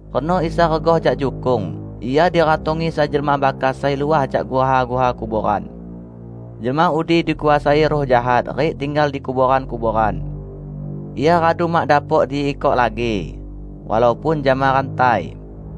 Reno Isa regah jak jukung, Ia diratongi sai jelma bakas sai luah jak guha-guha kuboran. Jelma udi dikuasai ruh jahat rik tinggal di kuboran-kuboran. Ia radu mak dapok diikok lagi; walaupun jama rantai.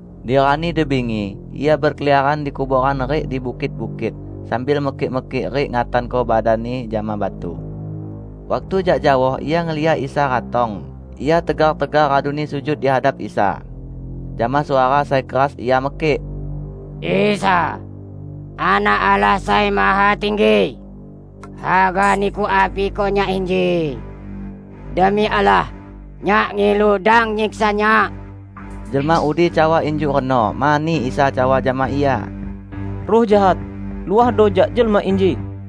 Di rani di bingi ia bekeliaran di kuboran rik di bukit-bukit, sambil mekik-mekik rik ngatanko badanni jama batu. Waktu jak jaoh ia ngeliak Isa ratong, ia tegar-tegar raduni sujud di hadap Isa. Jama suara sai keras ia mekik, "Isa, Anak Allah Sai Mahatinggi! Haga Niku apiko nyak inji? Demi Allah, nyak ngilu, dang nyiksa nyak!" ( Jelma udi cawa injuk reno mani Isa cawa jama ia, "Ruh jahat, luahdo jak jelma inji!")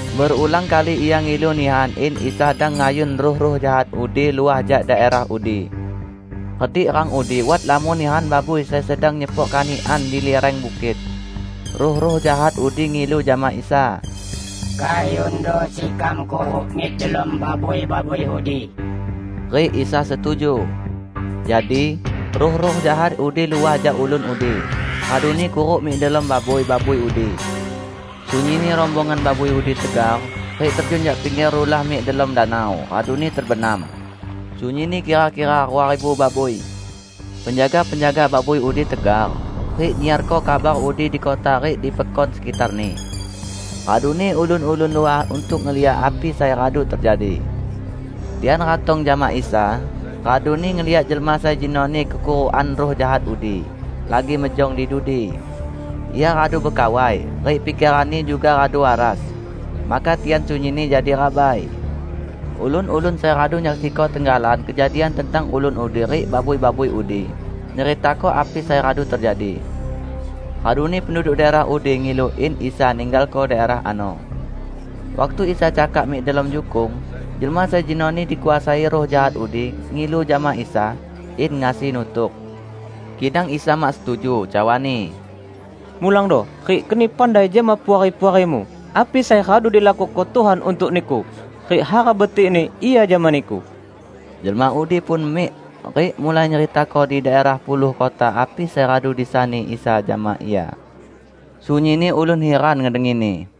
Berulang kali ia ngilu nihan in Isa dang ngayun ruh-ruh jahat udi luah jak daerah udi. Redik rang udi wat lamon nihan babui sai sedang nyepok kanikan di lireng bukit. Ruh-ruh jahat udi ngilu jama Isa, "Kayundo sekam kuruk mik delom babui-babui udi." Rik Isa setuju. Jadi, ruh-ruh jahat udi luah jak ulun udi raduni kuruk mik delom babui-babui udi. Sunyinni rombongan babui udi tegar rik terjun jak pingger rulah mik delom danau raduni tebenam -- sunyinni kira-kira rua ribu babui. Penjaga-penjaga babui udi tegar, rik nyiarko kabar udi di kota rik di pekon sekitarni. Raduni ulun-ulun luah untuk ngeliak api sai radu tejadi. Tian ratong jama Isa, raduni ngeliak jelma sai jenoni kekurukan ruh jahat udi, lagi mejong di dudi. Ia radu bekawai, rik pikeranni juga radu waras. Maka tian sunyinni jadi rabai. Ulun-ulun sai radu nyaksiko tenggalan kejadian tentang ulun udi rik babui-babui udi nyeritako api sai radu tejadi. Raduni penduduk daerah udi ngilu in Isa ninggalko daerah ano. Waktu Isa cakak mik delom jukung, jelma sai jenoni dikuasai ruh jahat udi ngilu jama Isa, in ngasi nutuk. Kidang Isa mak setuju, cawa-Ni, "Mulangdo rik keni pandai jama puari-puarimu api sai radu dilakuko Tuhan untuk niku rik hara betikni Ia jama niku!" Jelma udi pun mik, rik mulai nyeritako di daerah Puluh Kota api sai radu disani Isa jama ia. Sunyinni ulun hiran ngedengini.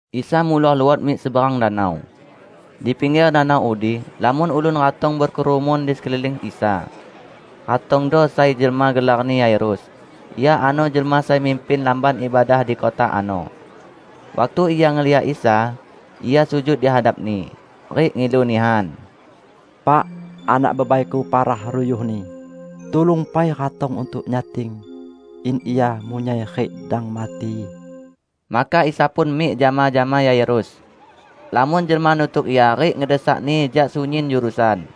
Isa muloh luot mik seberang danau. Di pingger danau udi, lamon ulun ratong bekerumun di sekeliling Isa. Ratongdo sai jelma gelarni Yairus. Ia ano jelma sai mimpin lamban ibadah di kota ano. Waktu ia ngeliak Isa, ia sujud di hadap-Ni, rik ngilu nihan, "Pak, anak bebaiku parah ruyuhni. Tulung pai ratong untuk nyating, in ia munyai rik dang mati!" Maka Isa pun mik jama-jama Yairus. Lamon jelma nutuk Ia rik ngedesak-Ni jak sunyin jurusan.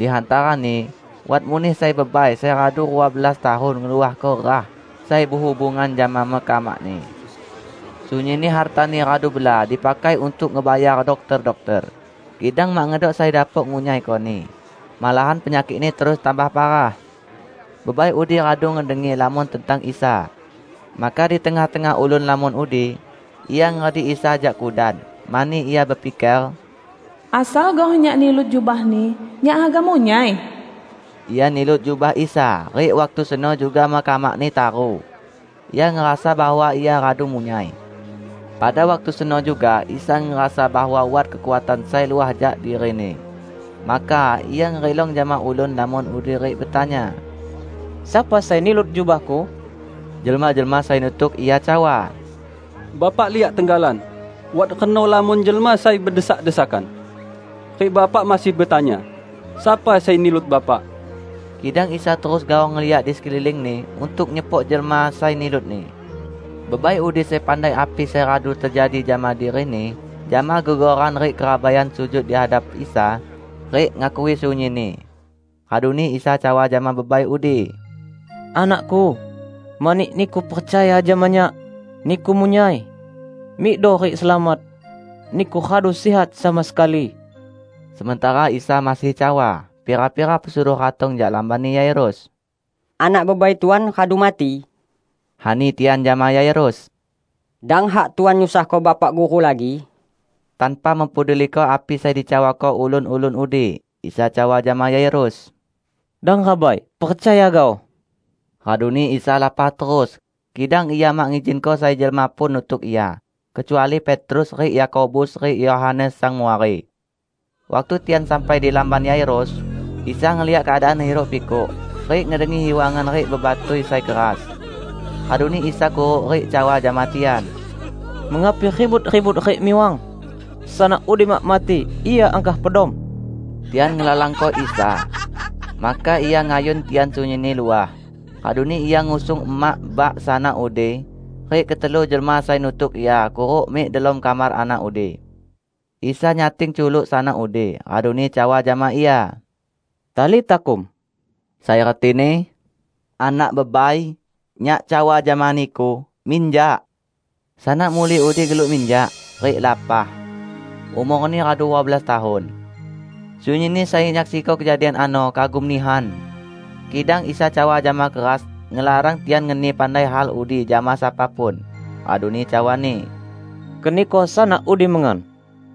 Di hantarani wat muneh sai bebai sai radu rua belas tahun ngeluahko ruah sai behubungan jama mekamakni. Sunyinni hartani radu bela dipakai untuk ngebayar dokter-dokter, kidang mak ngedok sai dapok ngunyaikoni, malahan penyakikni terus tambah parah. Bebai udi radu ngedengi lamon tentang Isa. Maka di tengah-tengah ulun lamon udi, ia ngeredik Isa jak kudan, mani ia bepiker, "Asal gaoh nyak nilut jubah-Ni, nyak haga munyai!" Ia nilut jubah Isa, rik waktu seno juga mekamakni taru. Ia ngerasa bahwa ia radu munyai. Pada waktu seno juga Isa ngerasa bahwa wat kekuatan sai luah jak diri-Ni. Maka Ia ngerilong jama ulun lamon udi rik betanya, "Sapa sai nilut jubah-Ku?" Jelma-jelma sai nutuk Ia cawa, "Bapak liak tenggalan wat reno lamon jelma sai bedesak-desakan. Rik Bapak masih betanya, sapa sai nilut Bapak?" Kidang Isa terus gaoh ngeliak di sekeliling-Ni untuk nyepok jelma sai nilut-Ni. Bebai udi sai pandai api sai radu tejadi jama dirini, jama gegoran rik kerabaian sujud di hadap Isa rik ngakui sunyinni. Raduni Isa cawa jama bebai udi, "Anak-Ku, mani niku percaya jama Nyak, niku munyai! Mikdo rik selamat. Niku radu sihat sama sekali." Sementara Isa masih cawa, pira-pira pesuruh ratong jak lambanni Yairus. "Anak bebai Tuan radu mati," ani tian jama Yairus. "Dang hak Tuan nyusahko Bapak Guru lagi." Tanpa mempeduliko api sai dicawako ulun-ulun udi, Isa cawa jama Yairus, "Dang rabai, percaya gaoh!" Raduni Isa lapah terus, kidang Ia mak ngizinko sai jelma pun nutuk Ia, kecuali Petrus rik Yakobus rik Yohanes sang muari. Waktu tian sampai di lamban Yairus, Isa ngeliak keadaan hiruk-pikuk, rik ngedengi hiwangan rik bebatui sai keras. Raduni Isa kuruk rik cawa jama tian, "Mengapi ribut-ribut rik miwang? Sanak udi mak mati; ia angkah pedom!" Tian ngelalangko Isa. Maka Ia ngayun tian sunyinni luah. Raduni Ia ngusung emak bak sanak udi rik ketelu jelma sai nutuk Ia kuruk mik delom kamar anak udi. Isa nyating culuk sanak udi, raduni cawa jama ia, "Talita kum," sai retini, "Anak bebai, Nyak cawa jama niku: minjak!" Sanak muli udi geluk minjak, rik lapah. (Umorni radu rua belas tahun.) Sunyinni sai nyaksiko kejadian ano kagum nihan! Kidang Isa cawa jama keras ngelarang tian ngeni pandai hal udi jama sapa pun. Raduni cawa-Ni, "Keniko sanak udi mengan."